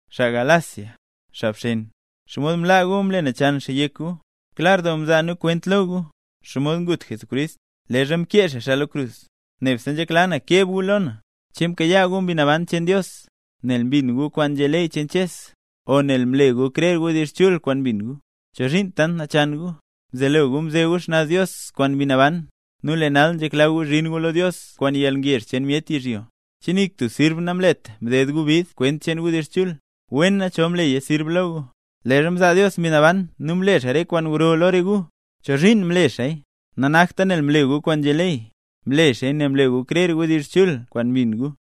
¡Xaa Galacia, xaa bxen! ¿Xomod mlaa gu mle nachan xaa yek gu? Klar doo mzaa nu kwent lo gu, xomod ngut Jesucrist, leezha mkee xaa xaa lo krus. Nebse nzhekla na keb gu lo na: ¿Che mkayaa gu Mbi Naban cheen Dios, nel mbin gu kwaan nzhé ley cheen Ches, o nel mle gu krer wdizh chul kwaan mbin gu? ¿Chozhiin tant nachan gu? Mzelo gu mze gu xnaz Dios kwaan Mbi Naban, nu lee nal nzhekla gu zhin gu lo Dios kwaan yalngezh cheen myet yizhyo. ¿Che nik tub sirb namlet mded gu bid kwent cheen wdizh chul? ¡Wena, chol mleya sirb lo gu! Leezha mzaa Dios Mbi Naban nu mle xaa re kwaan gro lo re gu, ¿chozhiin mle xaaya? Nanakta nel mle gu kwaan nzhé ley, mle xaaya nel mle gu krer wdizh chul kwaan mbin gu.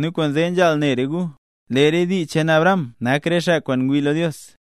Nu kwaanzee nzhaal ne re gu, lee re dii cheen Abraham nak re xaa kwaan ngwii lo Dios.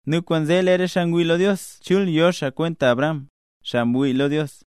Nu kwaanzee lee re xaa ngwii lo Dios chul yo xaa kwenta Abraham, xaa mwii lo Dios.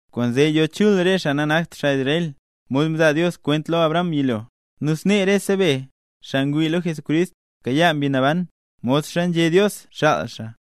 Kwaanzee yo chul re xaa nanakt xaa Israel, mod mzaa Dios kwent lo Abraham yilo. Nu snee rese be, xaa ngwii lo Jesucrist, mkayaa Mbi Naban, modxa nzhé Dios xaal xaa.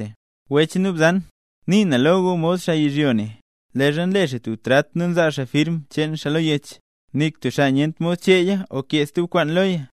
Wech nu bzan, nii na lo gu mod xaa yizhyo ne: Leezha nle xaa tub trat nu nzaa xaa firm cheen xaa lo yech, nik tub xaa nyent mod cheeya o kee stub kwaan loya.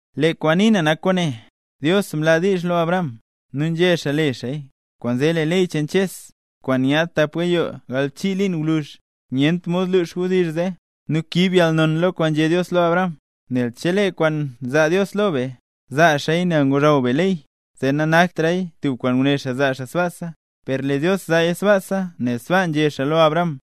Lee kwaan nii na nak kwaane: Dios mlaa diizh lo Abraham, nu nzhé xaa le xaaya. Kwaanzee, lee ley cheen Ches, kwaan nyaad tap gayoo galbchii liin gwluzh, nyent mod lux wdizh zee, nu kiib yalnon lo kwaan nzhé Dios lo Abraham. Nel chelee kwaan nzaa Dios lo be, zaa xaaya nel ngozhaw be ley, zee nanaktraya tub kwaan nguné xaa zaa xaa sbaasa. Per lee Dios nzaaya sbaasa nel sbaa nzhé xaa lo Abraham.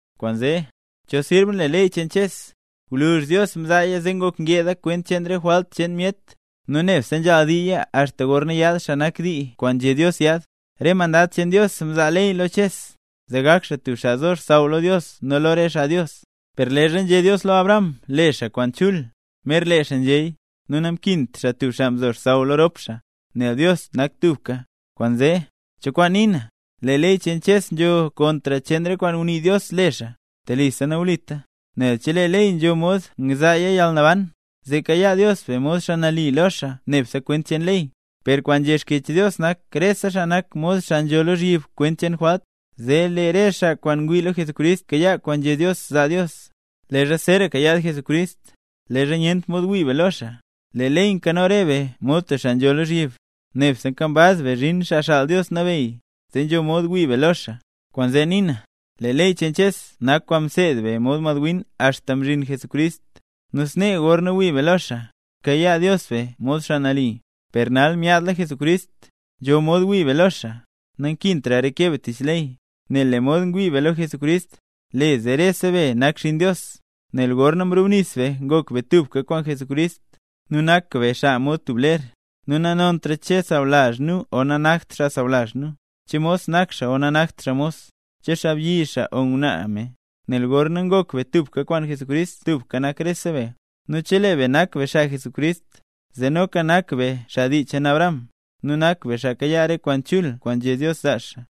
Kwaanzee, ¿cho sirb nle ley cheen Ches? Gwluzh Dios mzaaya zee ngok ngeda kwent cheen re jwalt cheen myet. Nu nebse nzhaal diiya axta gorna yaad xaa nak “dii” kwaan nzhé Dios yaad. Re mandad cheen Dios mzaa ley lo Ches, zee gak xaa tub xaa nzo xsaww lo Dios nu lo re xaa Dios. Per leezha nzhé Dios lo Abraham le xaa kwaan chul, mer lee xaa nzhéya, nu namkint xaa tub xaa mzo xsaww lo rop xaa, nel Dios nak tubka. Kwaanzee, ¿cho kwaan nii na, lee ley cheen Ches nzho kontr cheen re kwaan ngunii Dios le xaa? ¡Telisa nawlita! Nel chelee ley nzho mod ngzaaya yalnaban, zee kayaa Dios be mod xaa nali lo xaa nebse kwent cheen ley. Per kwaan nzhé Xkyech Dios nak rese xaa nak mod xaa nzho lozhyib kwent cheen jwalt. Zee lee re xaa kwaan ngwii lo Jesucrist kayaa kwaan nzhé Dios zaa Dios. Leezha zeeraka yaad Jesucrist, leezha nyent mod wii be lo xaa, lee ley nkano re be mod tub xaa nzho lozhyib, nebse nkambaz be zhin Xaa Xaal Dios Nabeyy, zee nzho mod wii be lo xaa. Kwaanzee nii na, lee ley cheen Ches nak kwaan mseed be mod madwin axta mzhin Jesucrist, nu snee gorna wii be lo xaa, kayaa Dios be mod xaa nali. Per nal myaadla Jesucrist, nzho mod wii be lo xaa, nankintra reke be tich ley, nel lee mod ngwii re be lo Jesucrist, le zee rese be nak xinn Dios. Nel gorna mrubnis be ngok be tubka kwaan Jesucrist, nu nak be xaa mod tub ler. Nu nanontra, che nak xaa sawlazh nu o nanakt xaa sawlazh nu, che mos nak xaa o nanakt xaa mos, che xaabyi xaa o ngwnaa me; nel gorna ngok be tubka kwaan Jesucrist tubka nak rese be. Nu chelee be nak be xaa Jesucrist, zee noka nak be xaa dii cheen Abraham, nu nak be xaa kayaa re kwaan chul kwaan nzhé Dios zaa xaa.